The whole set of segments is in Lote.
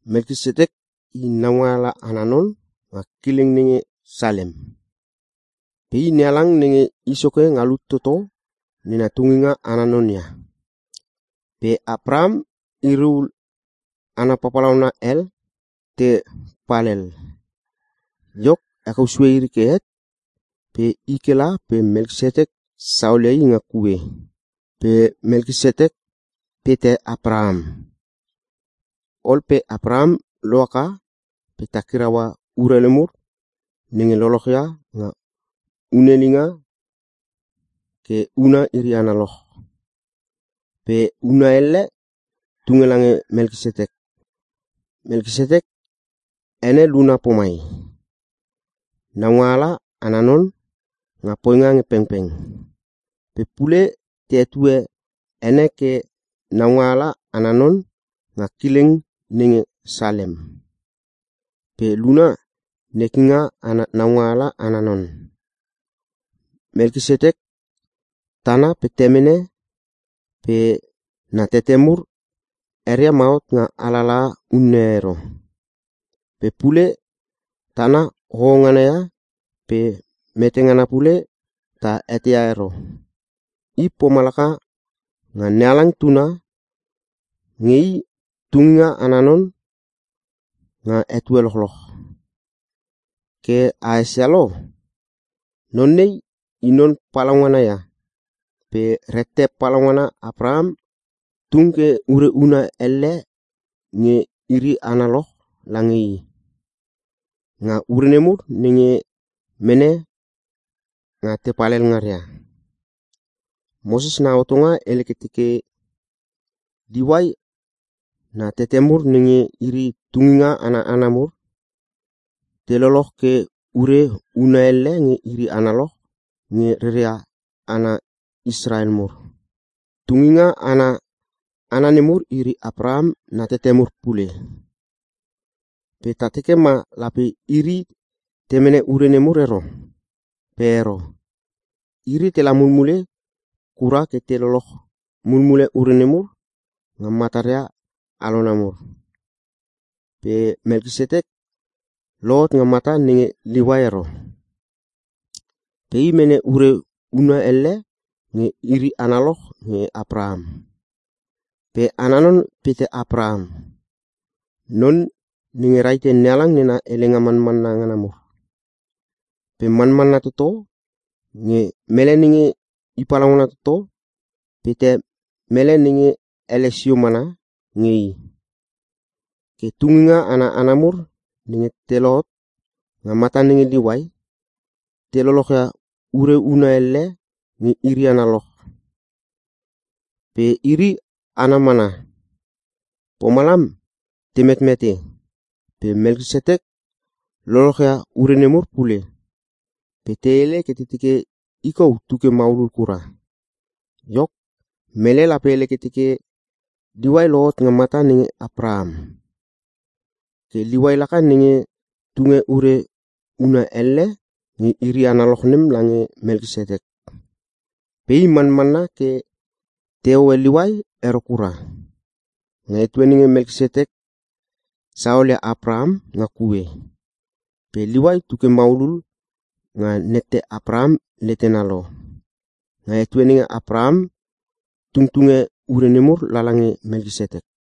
Melkisetek i naungaala ana non nga kileng nenge Salem. Pe i, NeHalang Nenge I Soke Nga Lut Toto nena tunginga ana non ia. Pe Apraham iri ul hana papalauna hel te palhel. Iok, hekou sue iri ke het pe i ke la pe Melkisetek saolia i nga kue. Pe Melkisetek pete Apraham. Ol pe Apraham lohaka pe takiraua urelu mur nenge lolochia nga hunelinga ke huna iri analoch. Pe huna elle, tunge lange Melkisetek. Melkisetek ene luna pomai, “naungaala ana non nga poinga nge pengpeng”. Pe pule, te hetue ene ke “naungaala ana non nga kileng nenge Salem.” Pe luna, “nekinga ana naungaala ana non.” Melkisetek tana pe temene pe na tete mur, eria ma hot nga alalaha unne e ero. Pe pule tana hoho ngana ia pe mete ngana pule ta eteia ero. I pomalaka nga NeHalang tuna nge i tunginga ana non nga etue lochloch. Ke a esia lo, non nei i non palaungana ia, pe rette palaungana Apraham tung ke ure huna elle nge iri analoch lange i, nga ure nemur nenge mene nga te palhel ngaria. Moses na hotonga hele ke teke, Liuai na tete mur nenge iri tunginga ana hana mur, te loloch ke ure huna elle nge iri analoch nge reria hana Israel mur. Tunginga ana hana nemur iri Apraham na tete mur pule, pe ta teke ma lape iri te mene ure nemur ero. Pe ero. Iri tela mulmule kura ke te loloch mulmule ure nemur nge mataria alona mur. Pe Melkisetek, lohot nga mata nenge Liuai ero. Pe i mene ure huna elle nge iri analoch nge Apraham. Pe ana non pete Apraham, non nenge rahite NeHalang nena helenga manmanna ngana mur. Pe manmanna toto nge mele nenge i palaungana toto pete mele nenge ele sio mana nge i. Ke tunginga ana hana mur nenge te lohot nga mata nenge Liuai, te lolochia ure huna elle nge iri analoch. Pe iri hana mana, pomalam te metmete. Pe Melkisetek lolochia ure nemur pule, pe te hele ke te teke i kou tu ke maulul kura. Iok, mele lape hele ke teke, Liuai lohot nga mata nenge Apraham. Ke Liuai laka nenge tunge ure huna elle nge iri analoch nem lange Melkisetek. Pe i manmanna ke te hoe Liuai ero kura, nga etue nenge Melkisetek saolia Apraham nga kue. Pe Liuai tu ke maulul nga nette Apraham letena lo, nga etue nenge Apraham tungtunge ure nemur lala nge Melkisetek.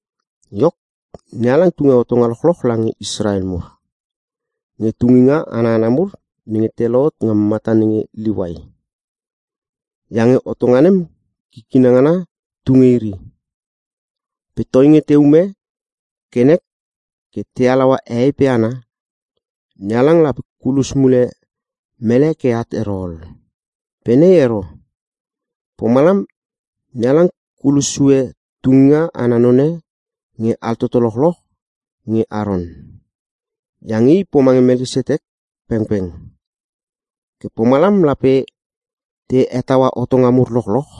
Iok, NeHalang tunge hotonga lochloch lange Israel mur, nge tunginga ana hana mur nenge te lohot nga mata nenge Liuai. Iange hotonga nem kikina ngana tu nge iri. Pe toinge te ume ke nek ke te halaua hehei pe hana, NeHalang lape kulos mule mele ke at ero ol. Pe nei ero. Pomalam NeHalang kulos sue tunginga ana none nge altoto lochloch nge Aron. Iange i pomange Melkisetek pengpeng. Ke pomalam lape te hetaua hotonga mur lochloch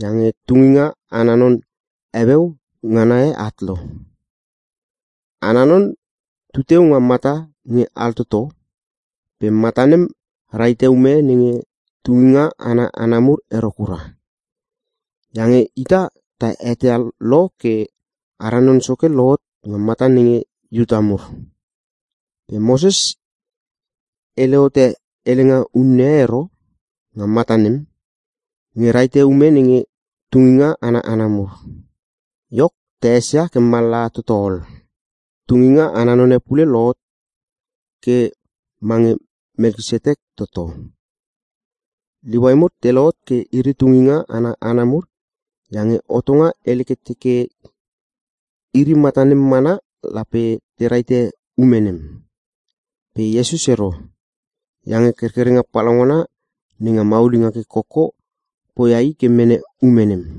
iange tunginga ana non heueu ngana e at lo. Ana Non, tu teu nga mata nge altoto pe mata nem rahite ume nenge tunginga ana hana mur ero kura. Iange ita ta eteia lo ke, ara Non Soke lohot nga mata nenge Iuta mur. Pe Moses hele hote helenga unne e ero nga mata nem nge rahite ume nenge tunginga ana hana mur. Iok, ta esia ke mallaha toto ol. Tunginga ana none pule lohot ke mange Melkisetek toto. Liuai mur te lohot ke iri tunginga ana hana mur iange hotonga hele ke teke iri mata nem mana lape te rahite ume nem. Pe Iesus ero, iange kerkerenga palaungana nenga maulinga ke koko, poia I ke mene ume nem.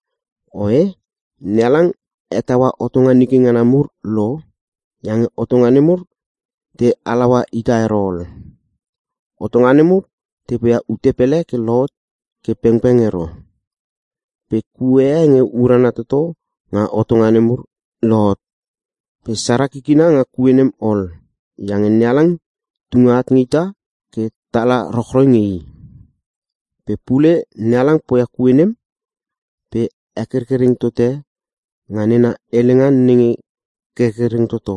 Oe, NeHalang hetaua hotonga nike ngana mur lo, iange hotonga nemur te halaua ita ero ol. Hotonga nemur te poia ute pele ke lohot ke pengpeng ero. Pe kue e nge urana toto nga hotonga nemur, lohot. Pe sara kikina nga kue nem ol. Iange NeHalang tunge at nge ita ke tala rochroi nge i. Pe pule, NeHalang poia kue nem pe hekerkereng tote nga nena helenga nenge kerkereng toto.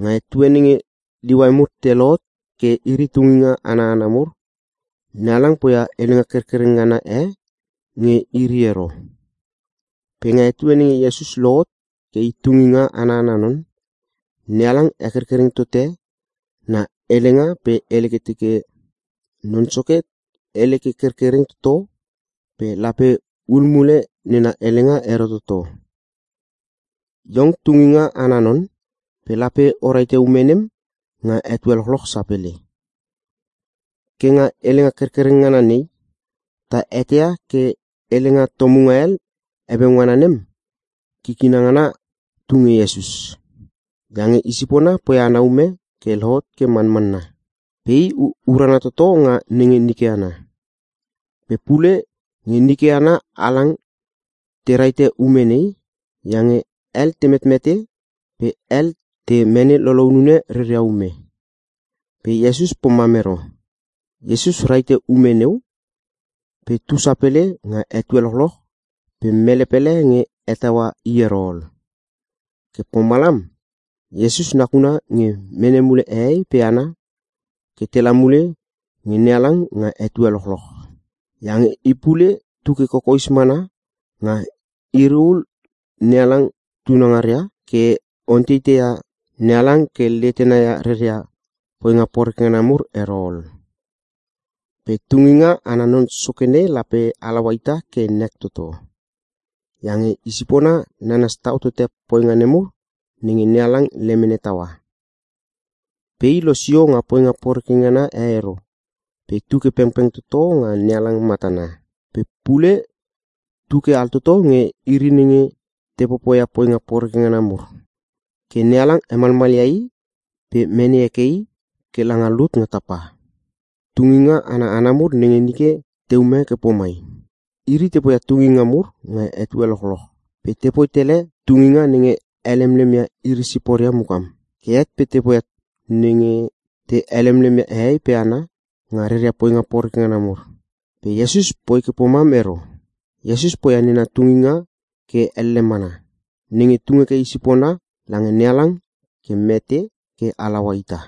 Nga etue nenge Liuai mur te lohot ke iri tunginga ana hana mur, NeHalang poia helenga kerkereng ngana e nge iri ero. Pe nga etue nenge Iesus lohot ke I tunginga ana non, NeHalang hekerkereng tote na helenga pe hele ke teke, “Non Soke hele ke kerkereng toto pe lape hul mule nena helenga ero toto. Iong tunginga ana non pe lape o rahite ume nem nga etue lochloch sapele.” Ke nga helenga kerkereng ngana nei, ta eteia ke helenga tomunga hel heueu ngana nem, kikina ngana tu nge Iesus. Iange i sipona poia ana ume ke lohot ke manmanna. Pe i urana toto nga nenge nike ana. Pe pule, nge nike hana halang te rahite ume nei iange hel te metmete pe hel te mene lolounune reria ume. Pe Iesus pomam ero. Iesus rahite ume neu pe tu sapele nga etue lochloch pe mele pele nge hetaua i ero ol. Ke pomalam, Iesus nakuna nge mene mule hehei pe hana ke tela mule nge NeHalang nga etue lochloch. Iange I pule tu ke kokoes mana nga iri ul NeHalang tunangaria ke onteiteia NeHalang ke letena ia reria poinga poreke ngana mur ero ol. Pe Tunginga ana Non Soke nei lape halaua ita ke nek toto. Iange i sipona nanas tau tote poinga nemur nenge NeHalang lemene taua. Pe i losio nga poinga poreke ngana e ero pe tu ke pengpeng toto nga NeHalang matana. Pe pule tu ke altoto nge iri nenge te popoia poinga poreke ngana mur. Ke NeHalang hemalmalia i pe mene heke i ke langa lut nga tapa. Tunginga ana hana mur nenge nike te ume ke pomai: Iri te poia tunginga mur nga etue lochloch. Pe tepoi tele tunginga nenge helemlem ia iri siporia mukam, ke het pe te poia nenge te helemlem ia hehei pe hana nga reria poinga poreke ngana mur. Pe Iesus poi ke pomam ero. Iesus poia nena tunginga ke elle mana, nenge tung heke i sipona lange NeHalang ke mete ke halaua ita.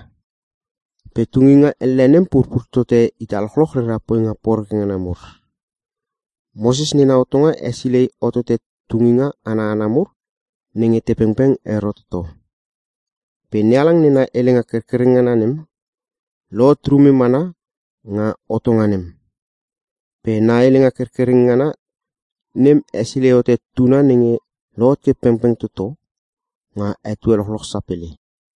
Pe tunginga elle nem purpur tote ita lochloch rera poinga poreke ngana mur. Moses nena hotonga hesilei hotote tunginga ana hana mur nenge te pengpeng ero toto. Pe NeHalang nena helenga kerkereng ngana nem, lohot rume mana nga hotonga nem. Pe na helenga kerkereng ngana nem hesilei hote Tuna nenge lohot ke pengpeng toto nga etue lochloch sapele.